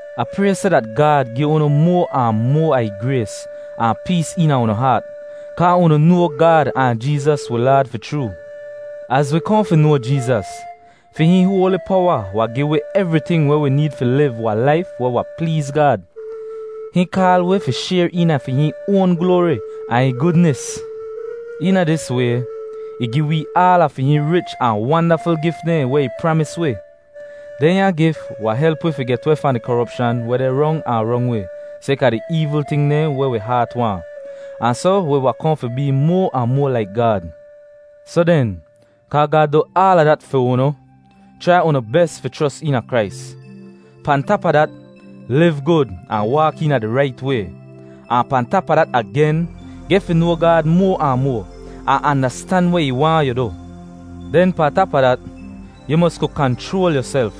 Ah pray seh dat Gaad gi unu moa ahn moa a ih grays ahn pees eena unu haat, kaa unu noa Gaad ahn Jeezas wi Laad fi chroo. Az wi kohn fi noa Jeezas, fi hihn hoali powa wahn gi wi evriting weh wi need fi liv wahn laif weh wahn pleez Gaad. Hihn kaal wi fi shayr eena fi hihn oan gloari ahn ih gudnis. Eena dis way ih gi wee aala fi hihn rich ahn wandaful gif dehn weh ih pramis wi. Dehnya gif wahn help wi fi get weh fahn di koropshan weh deh rong ahn rong wi sayka di eevl ting dehn weh wi haat waahn, ahn soh wi wahn kohn fi bee moa ahn moa laik Gaad. Soh den, kaa Gaad du aala dat fi unu, chrai unu bes fi chros eena Krais. Pahn tap a dat, liv gud ahn waak eena di rait way. Ahn pahn tap a dat agen, geh fi noa Gaad moa ahn moa, ahn andastan weh ih waahn yu du. Den pahn tap a dat, yu mos ku kanchroal yuself.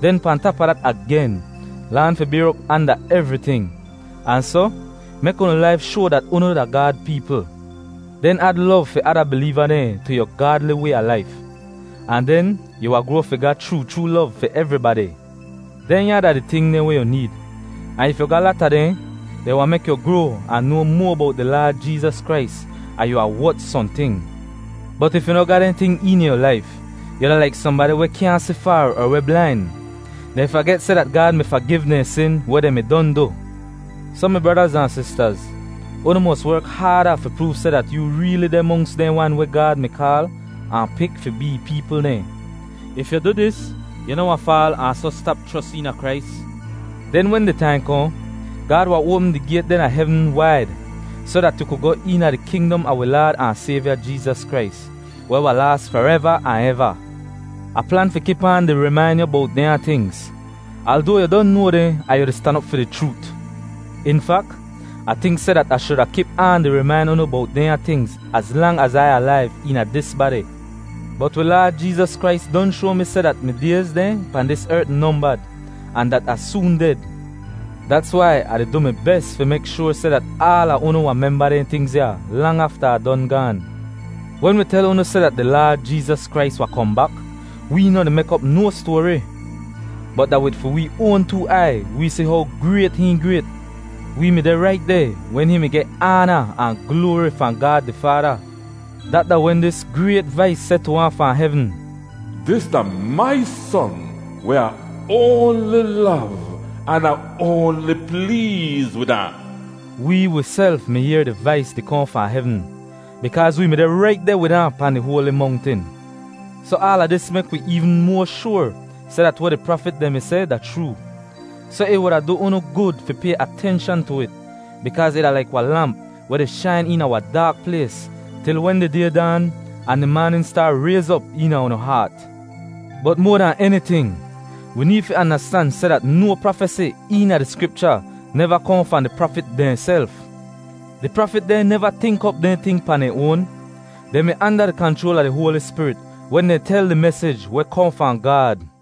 Den pahn tap a dat agen, laan fi bayr op anda evriting, ahn soh mek unu laif shoa dat unu da Gaad peepl. Den ad lov fi ada bileeva dehn tu yu gaadli way a laif, ahn den yu wahn groa fi ga chroo chroo lov fi evribadi. Dehnya da di ting dehn weh yu need, ahn if yu ga lata dehn, dehn wahn mek yu groa ahn noa moa bowt di Laad Jeezas Krais ahn yu wahn wot sohnting. Bot if yu noh ga dehn ting eena yu laif, yu da laik sohnbadi weh kyaahn si faar er weh blain. Dehn faget seh dat Gaad mi fagiv dehn sin weh dehn mi don du. Soh, mi bradaz ahn sistaz, unu mos werk haada fi proov seh dat yoo reeli deh monks dehn wan weh Gaad mi kaal ahn pik fi bee ih peepl dehn. If yu du dis, yu noh wahn faal ahn soh stap chros eena Krais. Den wen di taim kohn, Gaad wahn oapm di gayt dehn a hevn waid soh dat yu ku goh eena di kingdom a wi Laad ahn Sayvya Jeezas Krais, weh wahn laas fareva ahn eva. Ah plan fi kip aan di rimain yu bowt dehnya tingz, aldoa yu don noa dehn ahn yu di stan op fi di chroot. In fak, Ah tink seh dat Ah shuda kip aan di rimain unu bowt dehnya tingz az lang az Ai alaiv eena dis badi. Bot wi Laad Jeezas Krais don shoa mi seh dat mi dayz dehn pahn dis ert nombad ahn dat Ah soon ded. Dats wai Ah di du mi bes fi mek shoar seh dat aala unu wahn memba dehn tingz ya lang afta Ah don gaan. Wen wi tel unu seh dat di Laad Jeezas Krais wahn kohn bak, wee noh di mek op no stoari. Bot da wid fi wee oan too aiy wee si how grayt hihn grayt. Wee mi deh rait deh wen hihn mi geh aana ahn gloari fahn Gaad di Faada. Dat da wen dis grayt vais seh tu ahn fahn hevn, “Dis da mai Son weh Ah oanli lov, an Ah oanli pleez wid ahn.” Wee wiself mi yehr di vais di kohn fahn hevn, bikaaz wee mi deh rait deh wid ahn pahn di hoali mongtin. Soh aala dis mek wi eevn moa shoar seh dat weh di prafit dehn mi seh da chroo. Soh ih wuda du unu gud fi pay atenshan tu it, bikaaz ih da laik wahn lamp weh di shain eena wahn daak plays til wen di Day daan ahn di maanin staar rayz op eena unu haat. Bot moa dahn eniting, wi need fi andastan seh dat no prafesi eena di Skripcha neva kohn fahn di prafit dehnself. Di prafit dehn neva tink op dehn ting pahn dehn oan. Dehn mi anda di kanchroal a di Hoali Spirit wen dehn tel di mesij weh kohn fahn Gaad.